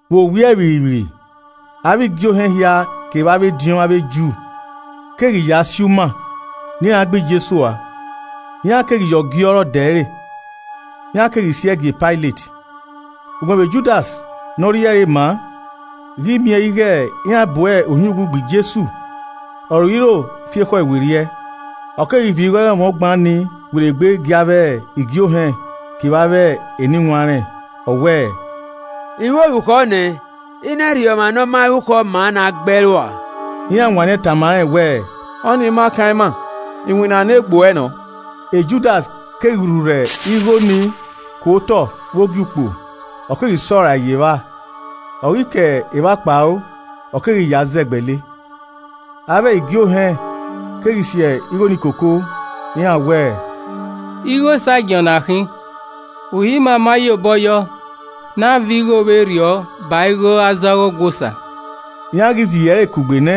Vbe owiẹ vbirrivbirri, avbe igie ohẹn hia kevbe avbe ediọn avbe Ju keghi ya si uma ne iran gbe Jesu ua. Iran keghi ya ọgiọrọ de ẹre, iran keghi si ẹe gie Pailet. Ugbẹn vbe Judas ne ọ rhie ẹre maa ghi miẹn ighe iran bu ohiẹn uwu gbe Jesu, ọ roiro fi ekhọe werriẹ, ọ keghi viọ igho ẹrọnmwọ ọgban nii werriegbe gie avbe igie ohẹn kevbe avbe eniwanrẹn, ọ wẹẹ, “I ru orukhọ ne I na rhie ọmwa ne ọ ma rukhọ maa ne a gbe ẹe rua.” Iran wanniẹn tama rẹn wẹẹ, “Ọ ni ma kan ima. Iwinna ne egbe uẹ nọ.” Judas keghi rhurhẹ igho nii ku otọ vbe Ogiukpo, ọ keghi sẹ ọe rae ye evba, ọ ghi ke evba kpao, ọ keghi ya zẹgbẹle. Avbe igie ohẹn keghi si igho ni koko iran wẹẹ, “Igho esagiẹn ọ na khin, uhi ima ma ye obọ yọ ne a viọ igho vberriọ ba igho aza ọghe Ọgua Osa.” Iran ghi zẹ iro ẹre kugbe nẹ,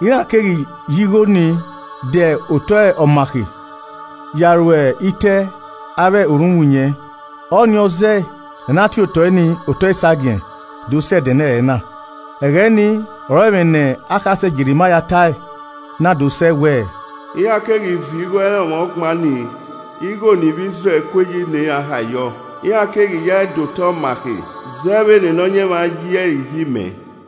iran keghi ya igho nii dẹ otọ Ọmakhe ya ru ite avbe orhunmwuyẹn. Ọnii ọ zẹẹ ne a na tie otọe nii “Otọe Esagiẹn” do sẹ ẹdẹnẹrẹ na. Ẹghẹ nii ọre ẹmwẹ ne akhasẹ Jerimaia tae na do sẹ wẹẹ, “Iran keghi viọ igho ẹrọnmwọ ọgban nii igho ne ivbi Izrẹl kue yi ne iran hae yọ. Iran keghi yae de otọ ọmakhe zẹ vbene Nọyaẹnmwa yi ẹre iyi mẹ.”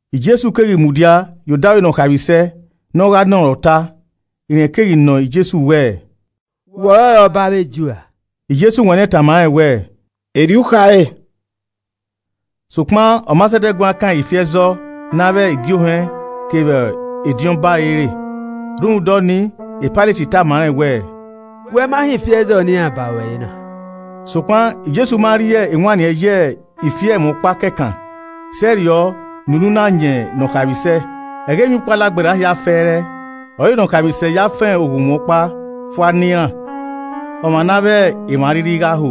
Jesu keghi mudia ye odaro Nọkhaemwisẹ ne ọ gha nọ rẹn ọta. Rẹn keghi nọ Jesu wẹẹ, “Wẹ ọrọre ọba avbe Ju ra?” Jesu wanniẹn tama rẹn wẹẹ, “Erriọ u khare.” Sokpan ọ ma zẹdẹ guan kan ifi ẹzọ ne avbe igie ohẹn kevbe ediọn ba ẹre re. Rhunmwuda ọnii Pailet tama rẹn wẹẹ, “Wẹ ma họn ifi ẹzọ ne iran ba ruẹ re na?” Sokpan Jesu ma rhie ewanniẹn ye ifi ẹmwẹ ọkpa kẹkan sẹrriọ ne unu na yan Nọkhaemwisẹ. Ẹghẹ Emwiukpo Alagberra hia fẹẹrẹ ọre Nọkhaemwisẹ ya fan oghunmwu ọkpa fua ne iran, ọmwa ne avbe emwa a rhirhi gha ho.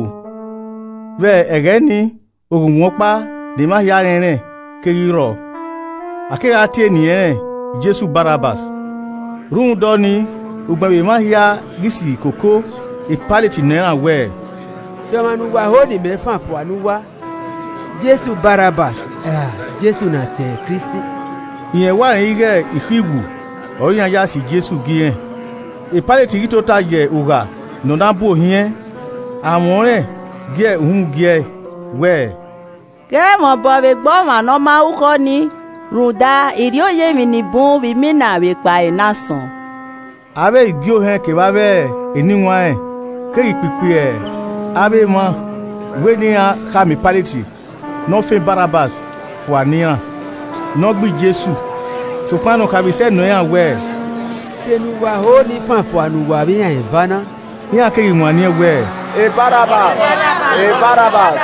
Vbe ẹghẹ nii oghunmwu ọkpa ne emwa hia rẹnrẹn keghi rrọọ, a kegha tie eni ẹnrẹn Jesu Barabbas. Rhunmwuda ọnii, ugbẹn vbe emwa hia ghi si koko, Pailet nọ iran wẹẹ, “De ọmwa ne uwa ho ne imẹ fan fua ne uwa, Jesu Barabbas ra Jesu ne a tie ẹre Kristi?” Rẹn wa rẹn ighe ikhuiwu ọre iran ya si Jesu gie irẹn. Pailet ghi tota ye ugha ne ọ na bu ohiẹn, amwẹ ọnrẹn gie uhunmwu giẹ wẹẹ, “Ghẹ mwẹ obọ vbe egbe ọmwa ne ọ ma rukhọ nii, rhunmwuda, I rrioya emwi ni bun vbe imina vbe ekpa ẹre ne asọn.” Avbe igie ohẹn kevbe avbe eniwanrẹn keghi kpikpi avbe emwa wẹ ne iran khama Pailet ne ọ fan Barabbas fua ne iran, ne ọ gbe Jesu. Sokpan Nọkhaemwisẹ nọ iran wẹẹ, “De ne uwa ho ne I fan fua ne uwa vbe iran eva na?” Iran keghi wanniẹn wẹẹ, “Barabbas.”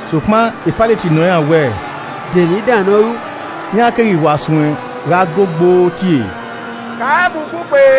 Sokpan Pailet nọ iran wẹẹ, “De emwi dan ne ọ ru?” Iran keghi wa suẹn gha go gboo tie, “Kan rẹn mu ugbugbe!”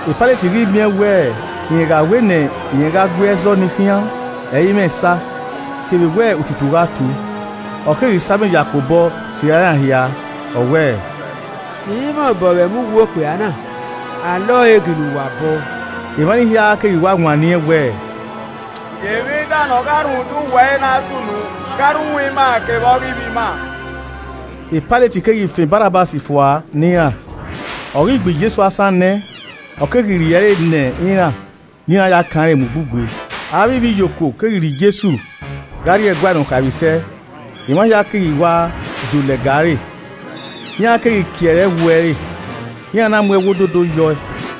Pailet ghi miẹn wẹẹ rẹn gha wẹ ne irẹn gha gui ẹzọ nii khian ẹ i mwẹ esa, kevbe wẹ otutu gha tu, ọ keghi sa amẹ ya kpe obọ sirra iran hia, ọ wẹẹ, “I i mwẹ obọ vbe ẹmwẹ uwu okpia na. A lẹ ọre ginna uwa obọ.” Emwa ni hia keghi wa wanniẹn wẹẹ, “Gie emwi dan ne ọ gha rhunmwuda uwu ẹre na sunu gha rre uhunmwu ima kevbe ọghe ivbi ima.” Pailet keghi fan Barabbas fua ne iran, ọ ghi gbe Jesu asan nẹ, ọ keghi rhie ẹre ne iran, ne iran ya kan rẹn mu ugbugbe. Avbe ivbiyokuo keghi rhie Jesu gha rrie ẹguae Nọkhaemwisẹ, emwa hia keghi wa do lẹga ẹre. Iran keghi kie ẹre ẹwu ẹre, iran na mu ẹwu ododo yọ ẹe.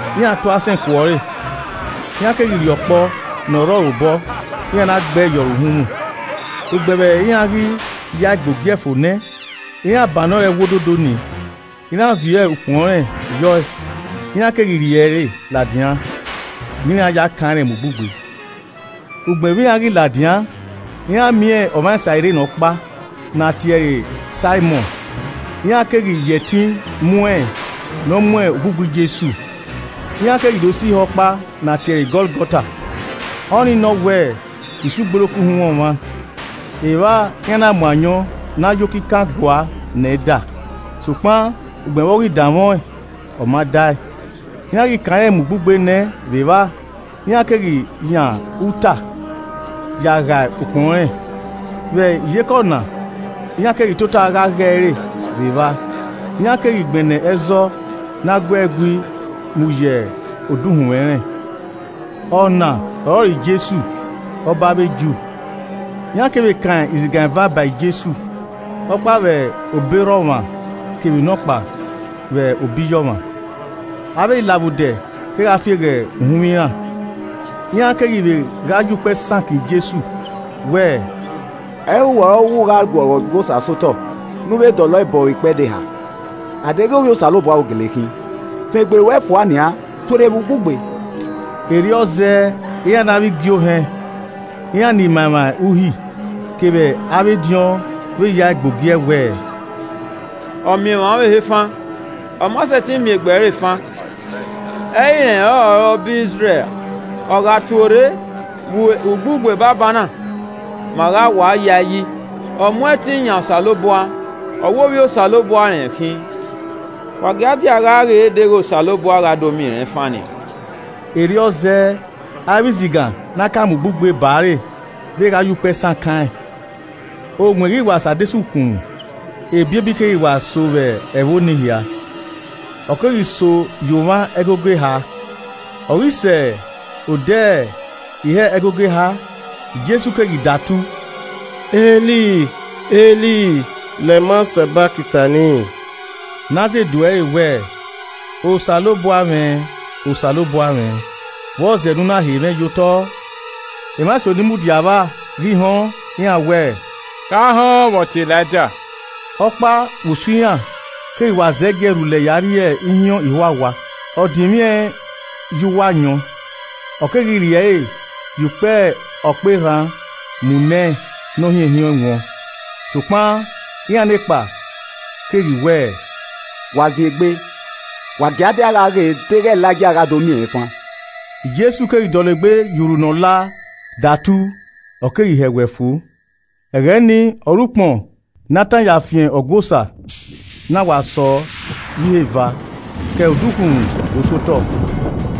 Iran tu asẹn ku ọre, iran keghi rhie ọkpọ ne ọ rre ọre obọ, iran na gbẹe yọ re uhunmwu. Ugbẹn vbe iran ghi ya ẹe gbe ogie fo nẹ, iran bannọ ẹre ẹwu ododo nii, iran viọ ukpọn rẹn yo ẹe, iran keghi rhie ẹre ladian ne iran ya kan rẹn mu ugbugbe. Ugbẹn vbe iran ghi ladian, iran miẹn ọmwa Sairin ọkpa ne a tie ẹre Saimọn, iran keghi ya ẹtin mu ẹn ne ọ mu ugbugbe Jesu. Iran keghi do sẹ ihe ọkpa ne a tie ẹre Gọlgọta, ọnii nọ wẹẹ, “Isi ugboloko uhunmwu ọmwa.” Evba iran na mu ayọn ne a ya okikan gua ne ẹn da, sokpan ugbẹn vbe ọ ghi danmwẹ ọẹn ọ ma dae. Iran ghi kan rẹn mu ugbugbe nẹ vbe evba, iran keghi yan uta ya ghae ukpọn rẹn. Vbe iyeke ọna iran keghi tota gha ghe ẹre vbe evba. Iran keghi gbẹnnẹ ẹzọ ne a guẹe gui mu ye odukhunmwu ẹnrẹn. “Ọna ọrọre Jesu, Ọba avbe Ju.” Iran kevbe kan izigan eva ba Jesu, ọkpa vbe obọ erha ọmwa kevbe nọkpa vbe obọ iye ọmwa. Avbe ilavbodẹ kegha fieghe uhunmwu iran, iran keghi vbe gha ya ukpẹ sakan Jesu wẹẹ, “Ẹ i re uwẹ ọre ọ wẹ, u gha guọghọ Ọgua Osa sẹ otọ, ne u vbe dọlọ ẹe bọ vbe ikpẹdẹ eha! A deghẹ Ovbi Osanobua u gele khin, fan egbe ruẹ fua nian. Tuorre vbe ugbugbe.” Erriọ zẹẹ iran ne avbe igie ohẹn, iran ni ma emwa Uhi kevbe avbe ediọn vbe ya ẹe gbe ogie wẹẹ, “Ọ miẹn emwa ọvbehe fan, ọ ma sẹtin miẹn egbe ẹre fan. Ẹ i irẹn ọrọre Ọba Izrẹl ra? Ọ gha tuorre vbe ugbugbe banbanna, ma gha wa ya ẹe yi. Ọ mu ẹtin yan Osanobua, ọ wẹ Ovbi Osanobua irẹn khin. Wa gia dia gha ghe deghẹ Osanobua gha do miẹn rẹn fan nian.” Erriọ zẹẹ, avbe izigan ne a kan mu ugbugbe ba ẹre vbe gha ye ukpẹ sakan ẹn. Owẹn ghi wa sẹ adesẹ ukhunmwu, ebiebi keghi wa so vbe ẹvbo ni hia, ọ keghi so ya omwa ẹgogo eha. Ọ ghi sẹ odẹ ihe ẹgogo eha, Jesu keghi datu, “El, El, lema sabaktani?” Ne a zẹ edu ẹre wẹẹ, “Osanobua mwẹ Osanobua mwẹ, vbọzẹ ne u na he mwẹ ye otọ?” Emwa eso ni mudia vba ghi họn, iran wẹẹ, “Gha họn vbe ọ tie Elaija.” Ọkpa vbe usun iran keghi wa zẹgiẹ rhulẹ ya rhie ihiọn ihuawa, ọ dinmwi ẹn ye uwu ayọn, ọ keghi rhie ẹre ye ukpẹ ọkpọ erhan mu nẹ ne ọ hiẹnhiẹn ọẹn wọn. Sokpan iran nekpa keghi wẹẹ, “Wa zin egbe, wa gia dia gha ghe deghẹ Elaija gha do miẹn rẹn fan.” Jesu keghi dọlegbe ya urhu ne ọla datu, ọ keghi hẹwẹ fo. Ẹghẹ nii, ọre ukpọn ne a tan ya fian Ọgua Osa na wa sọ ye iheva ke odukhunmwu do sẹ otọ.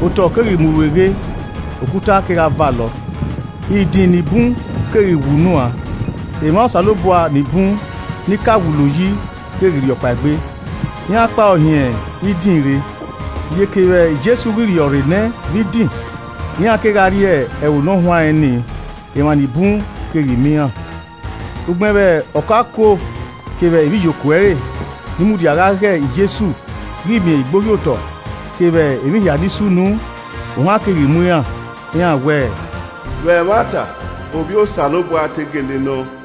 Otọe keghi mu rueghe, okuta kegha valọ. Idin ni bun keghi we unuan, emwa Osanobua ni bun ni ka wulo yi keghi rhiọkpaegbe. Iran kpao hin idin rre. Iyeke vbe Jesu ghi rhiọrre nẹ vbe idin, iran kegha rrie Ẹvbo Ne ọ huanrẹn nii, emwa ni bun keghi miẹn iran. Ugbẹn vbe ọkaokuo kevbe ivbiyokuo ẹre ni mudia gha ghe Jesu ghi miẹn igbohiotọ kevbe emwi hia ni sunu, ohan keghi mu iran, iran wẹẹ, “Vbe ẹmwata, Ovbi Osanobua te gele nọ.”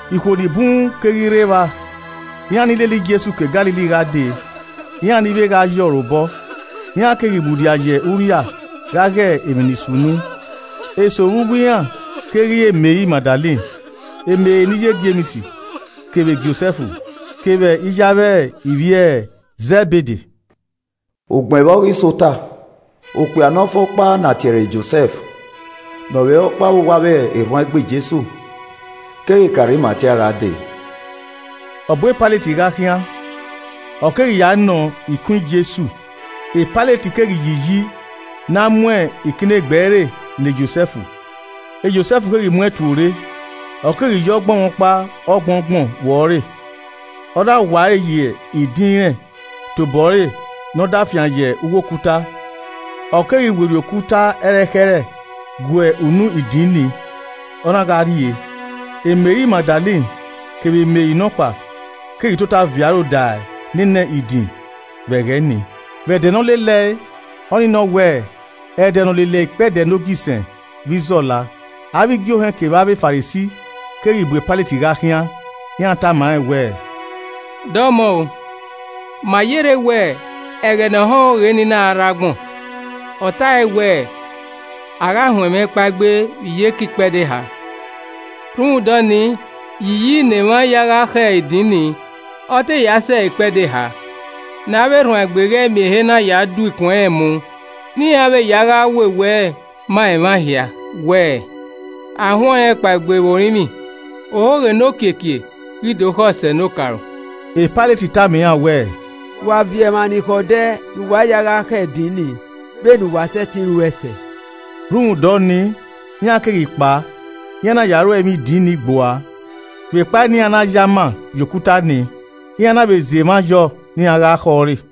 Ikhuo ni bun keghi rre evba, iran ni lele Jesu ke Galili gha dee, iran ni vbe gha ye ọre obọ, iran keghi mudia ye urria gha ghe emwi ni sunu. Eso vbe uwu iran keghi re Meri Magdalen, Meri ne iye Jems kevbe Josẹf kevbe iye avbe ivbi e Zẹbede. Ugbẹn vbe ọ ghi sẹ ota, okpia ne ọ fe ọkpa ne a tie ẹre Josẹf, ne ọ vbe re ọkpa vbe uwu avbe erhuanegbe Jesu, keghi ke Arimatia gha dee. Ọ bu Pailet gha khian, ọ keghi ya nọọn ikun Jesu. Pailet keghi yi iyi ne a mu ikinnegbe ẹre ne Josẹf. Josẹf keghi mu ẹn tuorre, ọ keghi ya ọgbọnmwọkpa ọgbọngbọn vbuẹ ọre. Ọ na wa ẹre ye idin irẹn tobọre ne ọ da fian ye uwu okuta. Ọ keghi werriẹ okuta ẹrẹkhẹrẹ gue unu idin ni, ọ na gha rrie. Meri Magdalen kevbe Meri nọkpa keghi tota viọ aro da nene idin vbe ẹghẹ ni. Vbe ẹdẹ ne ọ lelẹe, ọnii nọ wẹẹ, ẹdẹ ne ọ lele ikpẹdẹ nogisẹn vbe izọla, avbe igie ohẹn kevbe avbe Farisi keghi bu Pailet gha khian. Iran tama rẹn wẹẹ, “Dọmọ o, ma yerre wẹ ẹghẹ ne ọhọn ohoghe nii na rre agbọn, ọ tae wẹẹ, ‘A gha huẹn mwẹ kpaegbe vbe iyeke ikpẹdẹ eha.’ Rhunmwuda ọnii, yi iyi ne emwa ya gha khẹ idin nii ọ te ya sẹ ikpẹdẹ eha, ne avbe erhuanegbe ghẹ miẹn ehe na ya do ikun ẹnrẹn mu ne iran vbe ya gha wewe ẹe ma emwa hia wẹẹ, ‘A huẹn ọnrẹn kpaegbe vbe orinmwi.’ Ohoghe ne okiekie ghi do khọ sẹ ne okaro.” Pailet tama iran wẹẹ, “Wa viọ emwa ni khẹ odẹ ne uwa ya gha khẹ idin ni vbene uwa sẹtin ruẹe sẹ.” Rhunmwuda ọnii, iran keghi kpao iran na ya ru ẹmwẹ idin ni gbua vbekpa ne iran na ya ama ye okuta ni, iran na vbe zẹ emwa yọ ne iran gha khẹ ọre.